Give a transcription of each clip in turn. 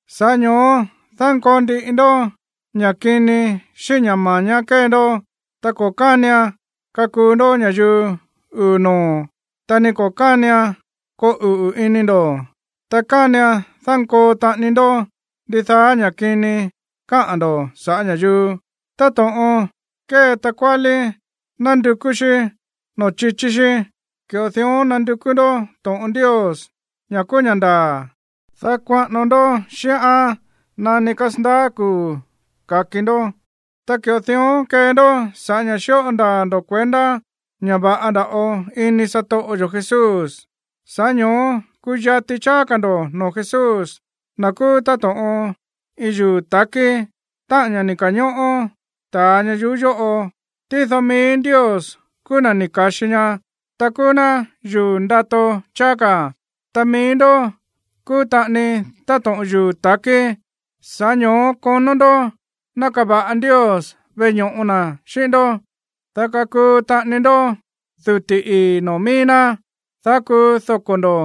Sa̱ꞌá ño̱ó dánkoo ndiꞌi ndó ña̱ kini xíꞌín ña̱ ma̱ñá kée ndó, ta ko̱ kánian kakuu ndó ña̱yuu uu̱ noo̱, ta ni ko̱ kánian koo uꞌu̱ ini ndo̱, ta kánian dánkoo taꞌani ndó ndidaá ña̱ kini káꞌa̱n ndo̱ sa̱ꞌá ña̱yuu. Táto̱ꞌon kée takuálí nándukú xí noo̱ chichí xí, ki̱ꞌo dión nandukú ndó to̱ꞌon Ndios, ña̱ kúú ña̱ ndaa̱, dá kuaꞌano ndó xíꞌán nani kasandaá kuu̱ ka̱ki ndó. Ta ki̱ꞌo dión kee ndó sa̱ꞌá ña̱ xíꞌo ndaa̱ ndo̱ kuendá ña̱ va̱ꞌa nda̱ꞌo ini satoꞌo yo̱ Jesús. Sa̱ꞌá ño̱ó kuyati cháá ka̱ ndo̱ noo̱ Jesús, na̱ kúú táto̱ꞌon iin yuu̱ ta̱kí, táꞌa̱n ña̱ ni̱ ka̱ñóꞌó ta̱a ñayuú yóꞌo. Tído mií Ndios kúú na̱ ni̱ ka̱xi ñaá, ta kúú ná yuu̱ ndato cháá ka̱. Ta mií ndó kúú taꞌani táto̱ꞌon yuu̱ ta̱kí. Sa̱ꞌá ño̱ó konó ndó ná kava̱ꞌa Ndios veꞌe ño̱ꞌo na̱ xíꞌín ndó, dá kakuu taꞌani ndó duti̱ ii̱ noo̱ mií ná, dá kuu doko̱ ndo̱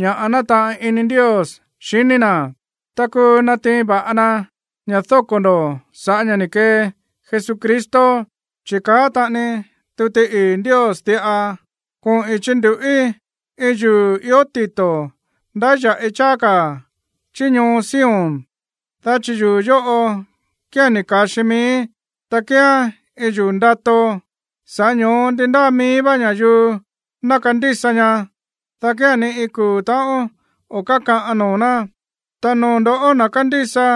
ña̱ nátaꞌan ini Ndios xiní na̱, ta kúú natiin va̱ꞌa na ña̱ dóko̱ ndo̱ sa̱ꞌá ña̱ ni̱ kee Jesucristo. Chi̱ káꞌa̱n taꞌani tuti ii̱ Ndios diꞌa: Koꞌi̱n chindu̱ꞌí iin yuu̱ ió tito̱ ndáya̱ꞌi cháá ka̱ chí ñoo Sion, dá chi̱ yuu̱ yóꞌo kía̱n ni̱ ka̱xi miíí, ta kíán iin yuu̱ ndato. Sa̱ꞌá ño̱ó ndi ndáa mií vá ña̱yuu ná kandísa ñaá, dá kía̱n ni iin kuu̱ ta̱ꞌón o̱ kákaꞌan noo̱ ná. Ta noo̱ ndo̱ꞌó, na̱ kándísa,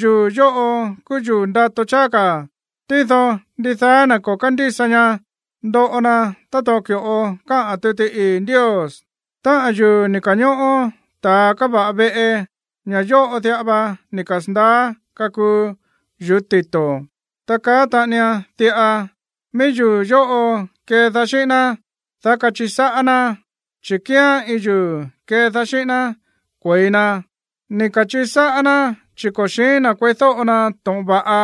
yuu̱ yóꞌo kúú yuu̱ ndato cháá ka̱. Tído ndidaá na̱ ko̱ kándísa ñaá, ndoꞌo na táto̱ꞌon ki̱ꞌo káꞌa̱n tuti ii̱ Ndios: Táꞌa̱n yuu̱ ni̱ ka̱ñóꞌó ta̱a káva̱ꞌa veꞌe, ña̱ yóꞌo diꞌa va ni̱ kasa̱ndaá kakuu yu̱ú tito̱. Ta káꞌa̱n taꞌanian diꞌa: Mií yuu̱ yóꞌo kédaá xíꞌín ná, dá kachiꞌi sáꞌá ná, chi̱ kíán iin yuu̱ kédaá xíꞌín ná kue̱i na. Ni̱ ka̱chiꞌi sáꞌá ná chi̱ ko̱ xi̱ín na̱ kueídóꞌo na to̱ꞌon va̱ꞌa,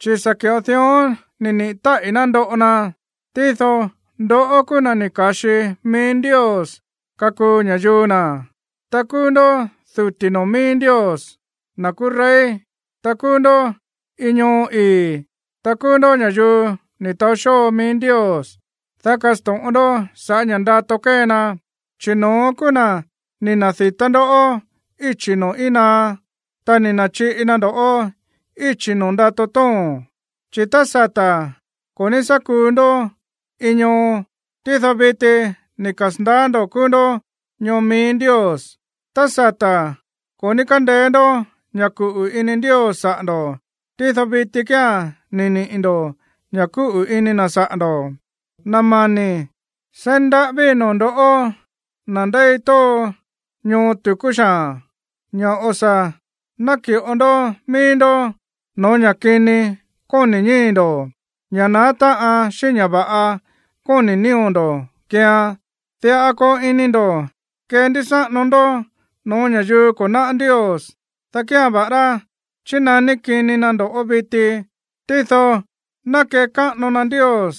chi̱ sa̱ ki̱ꞌo dión ni̱ niꞌi̱ táꞌi̱ ná ndoꞌo na. Tído ndoꞌó kúú na̱ ni̱ ka̱xi mií Ndios kakuu ña̱yuu na̱, ta kúú ndó duti̱ noo̱ mií Ndios, na̱ kúú rey, ta kúú ndó iin ñoo ii̱, ta kúú ndó ña̱yuu ni̱ taó xóo mií Ndios, dá kasto̱ꞌon ndó sa̱ꞌá ña̱ ndato kée na, chi̱ no̱ón kúú na̱ ni̱ na̱di̱tá ndoꞌó íchi̱ noo̱ íin naá, ta ni̱ na̱chiꞌi na ndo̱ꞌó íchi̱ no̱ó ndato tóo̱n. Chi̱ tá sata̱ ko̱ ní sá kuu ndó iin ñoo, tído viti ni̱ kasa̱ndaá ndo̱ kúú ndó ñoo mií Ndios. Tá sata̱ ko̱ ní kándeé ndó ña̱ kuꞌu̱ ini Ndios saꞌa̱ ndo̱, tído viti kía̱n ni̱ niꞌi̱ ndo̱ ña̱ kúꞌu̱ ini na̱ saꞌa̱ ndo̱. Na̱ mani̱, seí ndaꞌávíi̱ noo̱ ndo̱ꞌó, na̱ ndéi tóo ñoo tu̱kú xaa̱n, ña̱ o̱ sa̱ náki̱ꞌo ndó míí ndó no̱ó ña̱ kini kóni̱ ñíi̱ ndo̱, ña̱ naá táꞌan xíꞌín ña̱ va̱ꞌa kóni̱ nío̱ ndo̱ keean. Diꞌa koo ini ndo̱ kendúsáꞌano ndó no̱ó ña̱yuu ko̱ náꞌá Ndios, dá kía̱n va̱ꞌará chínaní kini na ndo̱ꞌó viti, tído ná kekáꞌano na Ndios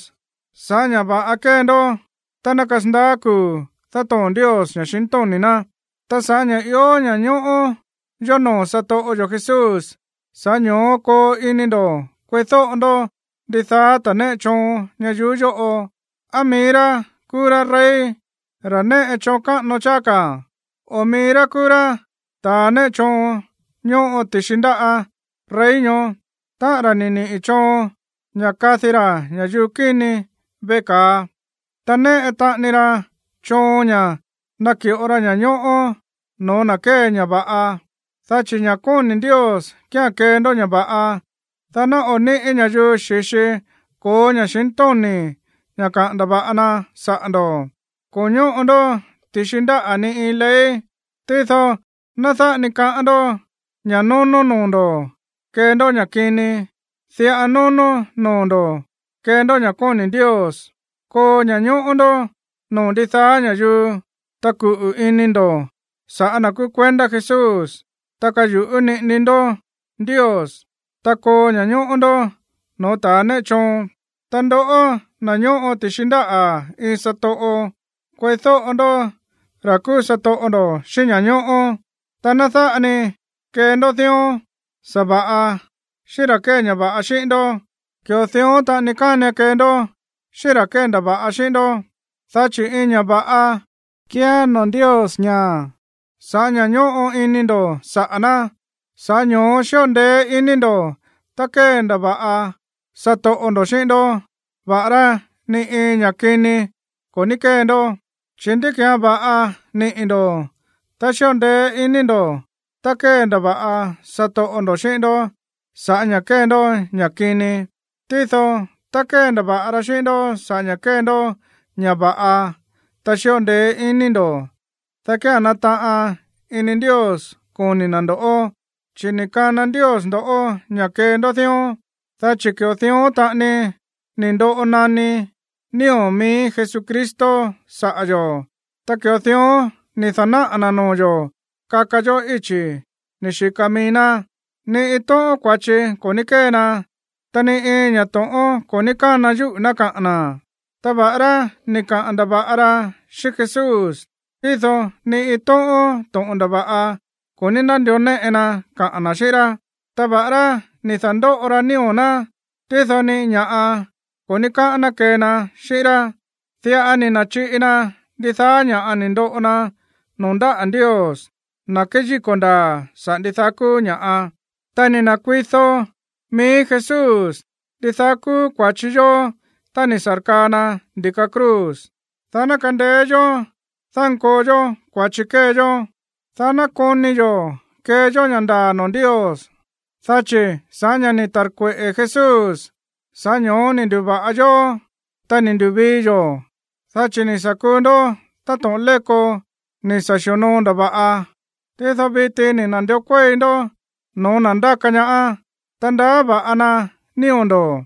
sa̱ꞌá ña̱ va̱ꞌa kée ndó tá ná kasandaá kuu̱ dátoo̱n Ndios ña̱xintóni̱ ná. Ta sa̱ꞌá ña̱ ió ña̱ñóꞌó yó noo̱ satoꞌo yo̱ Jesús, sa̱ꞌá ño̱ó koo ini ndo̱ kueídóꞌo ndó ndidaá ta̱ néꞌe choon ñayuú yóꞌo, á mií rá kúú rá rey, ra̱ néꞌe choon káꞌano cháá ka̱, o á mií rá kúú rá ta̱ néꞌe choon ñóꞌo ti̱xi ndáꞌa̱ rey ñoó, táꞌa̱n ra̱ ni̱ niꞌi̱ choon ña̱ kadi ra̱ ña̱yuu kíni veꞌe ka̱a, ta néꞌe taꞌani ra choon ña̱ náki̱ꞌo ra ña̱ñóꞌó no̱ó na̱ kée ña̱ va̱ꞌa. Dá chi̱ ña̱ kóni̱ Ndios kía̱n kee ndó ña̱ va̱ꞌa, dá ná o̱ níꞌi̱ ña̱yuu xi̱xi ko̱ó ña̱xintóni̱ ña̱ kaꞌa̱n ndava̱ꞌa na saꞌa̱ ndo̱. Ko̱ ñóꞌo ndó ti̱xi ndáꞌa̱ ni iin ley, tído ná dáꞌa ni kaꞌán ndó ña̱ nónó noo̱ ndo̱ kee ndó ña̱ kini. Diꞌa nónó noo̱ ndo̱ kee ndó ña̱ kóni̱ Ndios. Koo ña̱ñóꞌó ndó noo̱ ndidaá ña̱yuu, ta kuꞌu̱ ini ndo̱ sa̱ꞌá na̱ kúú kuendá Jesús, ta kayu̱ꞌú niꞌini ndó Ndios, ta koo ña̱ñóꞌó ndó no̱ó ta̱ néꞌe choon. Ta ndoꞌó, na̱ ñóꞌo ti̱xi ndáꞌa̱ iin satoꞌo, kueídóꞌo ndó ra̱ kúú satoꞌo ndo̱ xíꞌín ña̱ñóꞌó. Ta ná dáꞌa ni kee ndó dión sa̱va̱ꞌa xíꞌín ra̱ kée ña̱ va̱ꞌa xíꞌín ndó. Ki̱ꞌo dión taꞌani kánian kee ndó xíꞌín ra̱ kéndava̱ꞌa xíꞌín ndó. Dá chi̱ iin ña̱ va̱ꞌa kíán noo̱ Ndios ña̱ sa̱ꞌá ña̱ ñóꞌo ini ndo̱ saꞌa̱ ná, sa̱ꞌá ño̱ó xíꞌo ndeé iní ndo̱ tá kéndava̱ꞌa satoꞌo ndo̱ xíꞌín ndó, va̱ꞌará ni iin ña̱ kini ko̱ ní kée ndó. Chi̱, ¿ndí ki̱án va̱ꞌa niꞌi̱ ndo̱ tá xíꞌo ndeé iní ndo̱ tá kéndava̱ꞌa satoꞌo ndo̱ xíꞌín ndó sa̱ꞌá ña̱ kée ndó ña̱ kini? Tído tá kéndava̱ꞌa ra xíꞌín ndó sa̱ꞌá ña̱ kée ndó ña̱ va̱ꞌa, ta xíꞌo ndeé iní ndo̱, dá kía̱n nátaꞌan ini Ndios xiní na̱ ndo̱ꞌó. Chi̱ ni̱ kana Ndios ndo̱ꞌó ña̱ kee ndó dión, dá chi̱ ki̱ꞌo dión taꞌani ni̱ ndoꞌo naní nío̱ mií Jesucristo saꞌa̱ yo̱, ta ki̱ꞌo dión ni̱ da̱náꞌa̱ na̱ noo̱ yo̱ kaka yó íchi̱ ni̱ xika mií ná. “Ni iin tóꞌón kua̱chi ko̱ ní kée na, ta ni iin ña̱ to̱ꞌón ko̱ ní kána yúꞌu̱ ná kaꞌa̱n na̱.” Ta va̱ꞌará ni̱ kaꞌa̱n ndava̱ꞌa ra xíꞌín Jesús, tído ni iin tóꞌón to̱ꞌon ndava̱ꞌa ko̱ ní nándió néꞌe na kaꞌa̱n na̱ xíꞌín rá. Ta va̱ꞌará ni̱ da̱ndóꞌo ra nío̱ ná, tído ni iin ña̱ꞌa ko̱ ní kaꞌa̱n na̱ kee na xíꞌín rá. Diꞌa ni̱ na̱chiꞌi na ndidaá ña̱ ni̱ ndoꞌo na noo̱ ndáꞌa̱ Ndios, na̱ kéyíko̱ ndaa̱ saꞌa̱ ndidaá kúú ña̱ꞌa. Ta ni̱ na̱kuido mií Jesús ndidaá kúú kua̱chi yó tá ni̱ sa̱rkaa na ndi̱ka cruz, dá ná kandeé yó dánkoo yó kua̱chi kée yó, dá ná koni yo̱ kee yó ña̱ ndaa̱ noo̱ Ndios. Dá chi̱ sa̱ꞌá ña̱ ni̱ ta̱rkueꞌe̱ Jesús, sa̱ꞌá ño̱ó ni̱ ndu̱va̱ꞌa yó, ta ni̱ ndu̱vii yo̱. Dá chi̱ ni̱ sa̱ kuu ndó táto̱ꞌon léko ni̱ sa̱ xi̱onoo ndava̱ꞌa. Tído viti ni̱ na̱ndió kuéi ndó no̱ó na̱ ndáka ñaá, ta ndaá va̱ꞌa na nío̱ ndo̱.